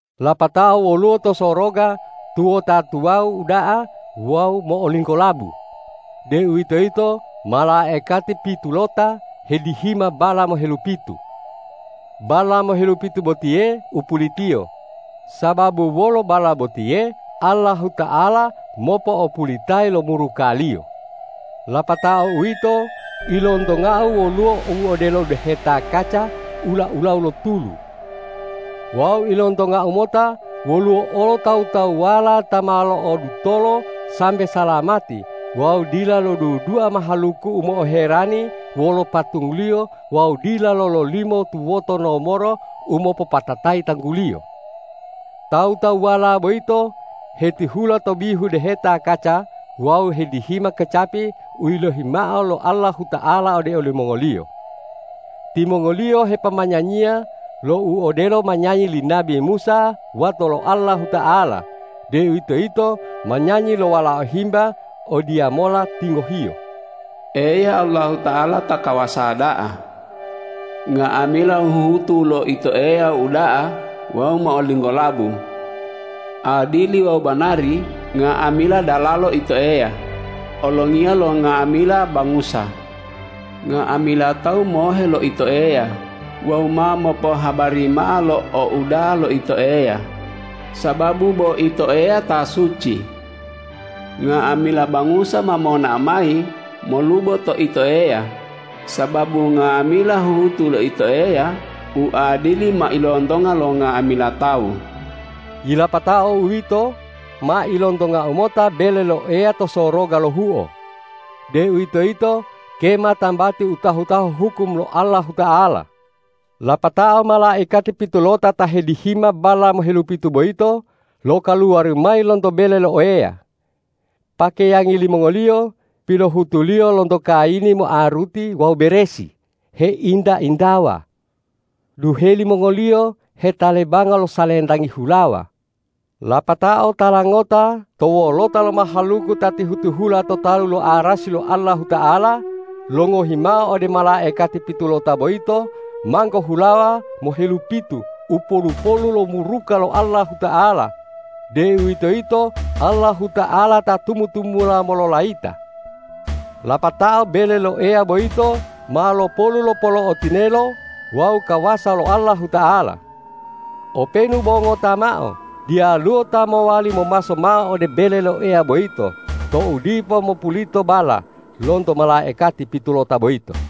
Lapatao woluwo to soroga tuwota tuwawu uda'a wawu mo'olinggolabu, deuwitoyito malaikati pitulota hedihima balla mohelupitu. Balla mohelupitu botiye u pulitiyo, sababu wolo balla botiye Allahuta'ala mopo'opulitayi lo muruka-Liyo. Lapatao uwito, ilontongau woluwo u odelo deheta kaca ula-ulawu lo tulu. Wawu ilontongau mota woluwo olo tawu-tawuwala ta ma lo'odutolo sambe salamati wawu dila lodudua mahaluku u mo'oherani wolo patungliyo wawu dila lololimo tuwoto nomoro u mopopatatayi tangguliyo. Tawu-tawuwala boyito hetihula to bihu deheta kaca wawu hedihima kecapi u yilohi mao lo Allahuta'ala ode olimongoliyo. Timongoliyo hepomanyanyiya lo u odelo manyanyi li nabi Musa wato lo Allahuta'ala, deuwitoyito manyanyi lo Walao Himba odiyamola tingohiyo,”Eya, Allahuta'ala ta kawasa da'a! Nga'amila huhutu lo Ito Eya uda'a wawu mo'olinggolabu. Adili wawu banari nga'amila dalalo Ito Eya, Olongiya lo nga'amila bangusa! Nga'amila tawu mohe lo Ito Eya wawu ma mopohabari mao lo ouda'a lo Ito Eya, sababu bo Ito Eya ta suci. Nga'amila bangusa ma monao mayi molubo to Ito Eya, sababu nga'amila huhutu lo Ito Eya u adili ma ilontonga lo nga'amila tawu.” Yilapatao uwito, ma ilontongau mota bele lo Eya to soroga lohuo, deuwitoyito kema tambati u tahu-tahu hukum lo Allahuta'ala. Lapatao malaikati pitulota ta hedihima balla mohelupitu boyito lokaluwari mayi lonto bele lo Eya. Pakeyangi limongoliyo pilohutuliyo lonto kayini moaruti wawu beresi, heinta-intawa. Duheli mongoliyo hetalebanga lo salentangi hulawa. Lapatao tala ngota to wolota lo mahaluku ta tihu-tihula to talu lo arasi lo Allahuta'ala, longohi mao ode malaikati pitulota boyito manggo hulawa mohelupitu u polu-polu lo muruka lo Allahuta'ala, deuwitoyito Allahuta'ala ta tumu-tumula mololayita. Lapatao bele lo Eya boyito ma lopolu lo polo'o tinelo wawu kawasa lo Allahuta'ala. Openu bo ngota mao, diyaluwo ta mowali momaso mao ode bele lo Eya boyito tou dipo mopulito balla lonto malaikati pitulota boyito.